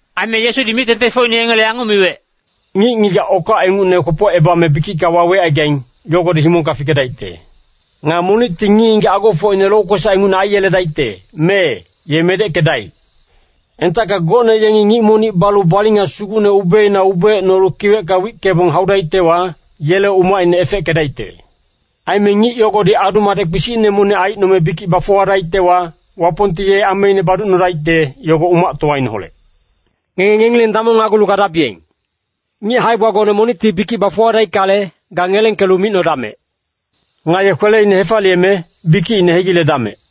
Aime Yesudi mic-tengtengfocine yengele yanguc miwec, “Ngic-ngigac okac ingucne kwopocebame bikicka wawecaigaing, yogodi himongka fikedaicte. Nga monicti ngic-ngigac agofocine lokwesac ingucne aiyeledaicte, mee, ye medeckedaic. Entacka gocne yengi ngic monic balu balinga sugucne ubeina ubeecnolu kiwecka wickebong haudaictewa, yele umacine efeckedaicte. Aime ngic yogodi adu-madec kpisicne monic aicnome bikic bafuwadaictewa, Wapongti ye ameine baducnodaicte, yogo umactowaineholec. Ngenge ngengileng damongnagulu gadabiyeng. Ngic hae-gbagone monicti bikic bafuwadaickale, ga ngelengkelu micnodamec. Nga ye kweleine hefaliyeme, bikicine hegiledamec.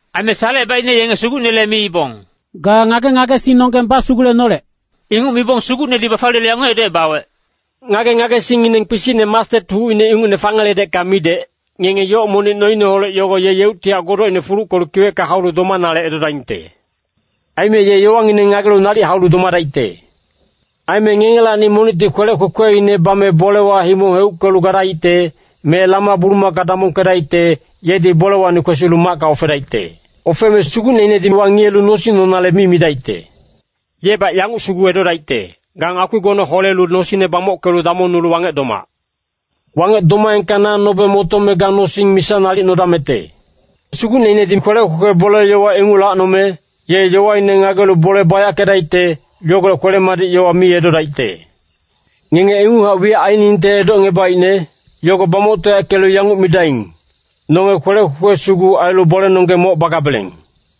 Aime Salecebaicne yenge Sugucnele miibong, “Ga ngage-ngagesingnonggeng basugulenolec.” Inguc mibong Sugucnedi bafaliyelu yanguc edocebawec, “Ngage-ngagesingngineng kpisicne mastet hucine ingucne fangeledecka midec, ngenge yoc monic noineholec yogo ye yeuctihac godocine fuluckelu kiwecka haulu domanale edodaingte. Aime ye yowangineng ngagelu nalic haulu domadaicte. “Aime ngengelacni monicti kwelec kwekweine bame bolewa himong heuckelu gadaicte, me lama-bulumaka damongkedaicte, yedi bolewacni kwesilu macka ofedaicte. Ofeme sugucneinedi wangiyelu nosing nonale mi midaicte. Yebac yanguc sugu edodaicte, ‘Ga ngakpigone holelu nosingne bamockelu damongnulu wangec domac. Wangec domaengka na nobe motome ga nosing misa nalic nodamecte.’ Sugucneinedi kwelec kwekwe bole-yowa inguc lacnome, ye yowaine ngagelu bole bayackedaicte, yogolec kwele-madic yowa mi edodaicte. Ngenge inguchac wiyac ainingte edocngebaicne, yogo bamoctoyackelu yanguc midaing, ‘Nonge kwelec kwekwe sugu ailu bolenonggeng moc bagabeleng.’”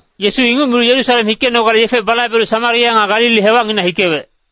Yesu inguc milu Yerusalem hikenogale yefe balaibelu Samaria nga Galili hewacnginac hikewec.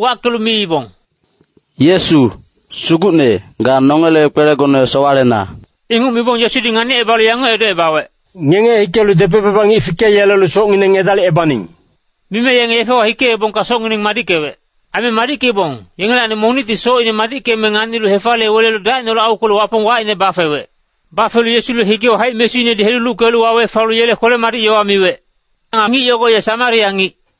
wackelu miibong, “Yesu, Sugucne, ga nongele kwelegone sowalena.” Inguc mibong Yesudi nganicebalu yanguc edocebawec, “Ngenge hikelu depec-baba ngic fikeyelelu socngineng edalicebaning.” Mime yenge yefewa hikeebongka socngineng madickewec. Aime madickeibong, yengelacni monicti socine madickeme nganilu hefaliye wele dacineholec aukwelu Wapong wacine bafewec. Bafelu Yesule higewa haic-mesuinedi heluluckelu wawe falu yele kwele-madic yowa miwec. Nga ngic yogo ye Samaria ngic.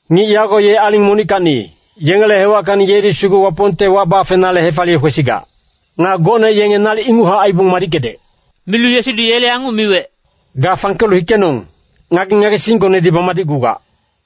Ngic yago ye aling monickacni, yengele hewackacni yedi sugu Wapongte wac bafenale hefaliye kwesigac. Nga gocne yenge nalic inguchac aibong madickedec.” Milu Yesudi yele yanguc miwec, “Ga fangkelu hikenong, ngage-ngagesinggonedi bamadicgugac.”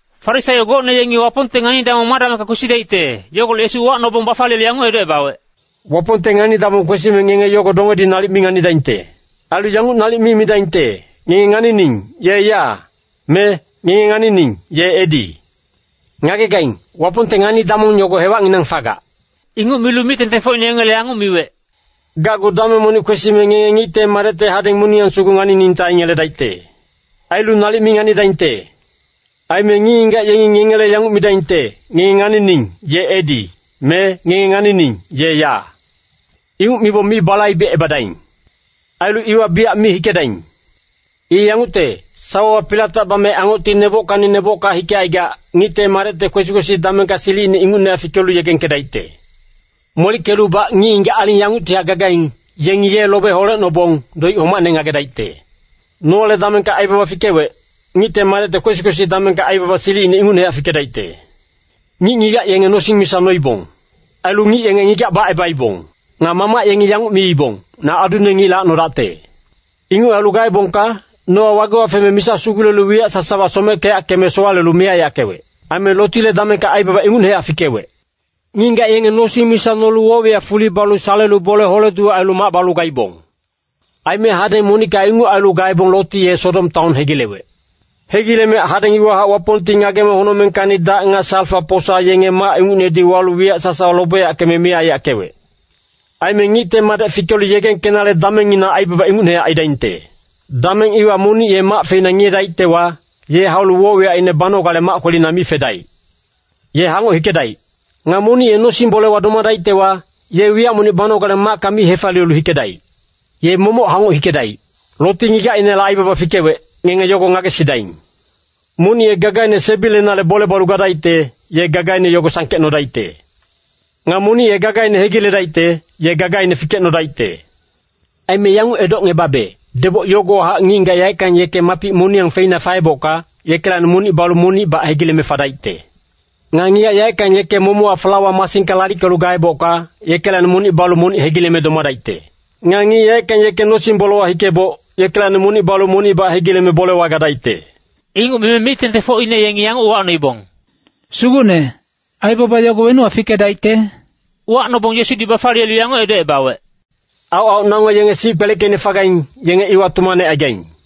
Farisaio gocne yengi Wapongte ngani-damong ma damengka kwesidaicte, yogolec Yesu uwacnobong bafaliyelu yanguc edocebawec, “Wapongte ngani-damong kwesime ngenge yogo dongedi nalic mi nganidaingte. Ailu yanguc nalic mi midaingte, ‘Ngenge nganining, ye ya, me ngenge nganining, ye edi.’ Ngagegaing, Wapongte ngani-damong yogo hewacnginang fagac.” Inguc milu mic-tengtengfocine yengele yanguc miwec, “Gacgu dameng monic kwesime ngenge Ngicte Madecte hadeng moniyang sugu nganiningte aingeledaicte. Ailu nalic mi nganidaingte. Aime ngic-ngigac yengi ngengele yanguc midaingte, ‘Ngenge nganining, ye edi,’ me ‘Ngenge nganining, ye ya.’ Inguc mibong mi balaibecebadaing. Ailu iwa biyac mi hikedaing. I yangucte, sawawa pilatac bame angocti nebockacni nebocka hikecaigac, Ngicte Madecte kwesi-kwesi damengka silicine ingucnehac fikelu yegengkedaicte. Molickelubac ngic-ngigac aling yanguctihac gagaing, yengi ye lobe holecnobong, doic homacne ngagedaicte. “Noale damengka aibaba fikewec, Ngicte Madecte kwesi-kwesi damengka aibaba silicine ingucnehac fikedaicte. Ngic-ngigac yenge nosing misa noibong. Ailu ngic yenge ngigac bacebaibong. Nga mamac yenge yanguc miibong, ‘Na adune ngic lacnodacte.’ Inguc ailu gaebongka, Noa wagewa feme misa sugulelu wiyac sasawa someckeyackeme sowalelu miyac aiyackewec. AimeLotile damengka aibaba ingucnehac fikewec. Ngic-ngigac yenge nosing misa nolu woc-wiyac fuli balu salelu bole hole-duwec ailu mac balu gaibong. Aime hadeng monicka inguc ailu gaebong Loti ye Sodom taon hegilewec. Hegileme hadeng iwahac Wapongti ngageme honocmengkacni dac nga salfa-posa yenge mac ingucnedi walu wiyac sasawa lobeyackeme miyac aiyackewec. Aime Ngicte Madec fikelu yegengkenale damengngina aibaba ingucnehac aidaingte. “Dameng iwa monic ye mac feina ngiyedaictewa, ye haulu woc-wiyacine banogale mac kwelina mi fedaic. Ye hangoc hikedaic. Nga monic ye nosing-bolewa domadaictewa, ye wiyac monic banogale macka mi hefaliyelu hikedaic. Ye momoc hangoc hikedaic. Loti ngigacinela aibaba fikewec, ngenge yogo ngagesidaing. Monic ye gagaine sebilenale bole balu gadaicte, ye gagaine yogo sangkecnodaicte. Nga monic ye gagaine hegiledaicte, ye gagaine fikecnodaicte. Aime yanguc edocngebabe, deboc yogowahac ngic-ngigac yaeckang yeke mapic moniyang feina faebocka, yekelacni monic balu monicbac hegileme fadaicte. Nga ngigac yaeckang yeke momochac flawa masingka lalickelu gaebocka, yekelacni monic balu monic hegileme domadaicte. [Nga ngic yaeckang yeke nosing-bolewa hikeboc, yekelacni monic balu monicbac hegileme bolewa gadaicte.]” Inguc mime mic-tengtengfocine yengi yanguc uwacnoibong, “Sugucne, aibaba yogo wenuwa fikedaicte?” Uwacnobong Yesudi bafaliyelu yanguc edocebawec, “Aoc-aoc nango yenge sic kpeleckeicne fagaing, yenge iwa tumanecaigaing.”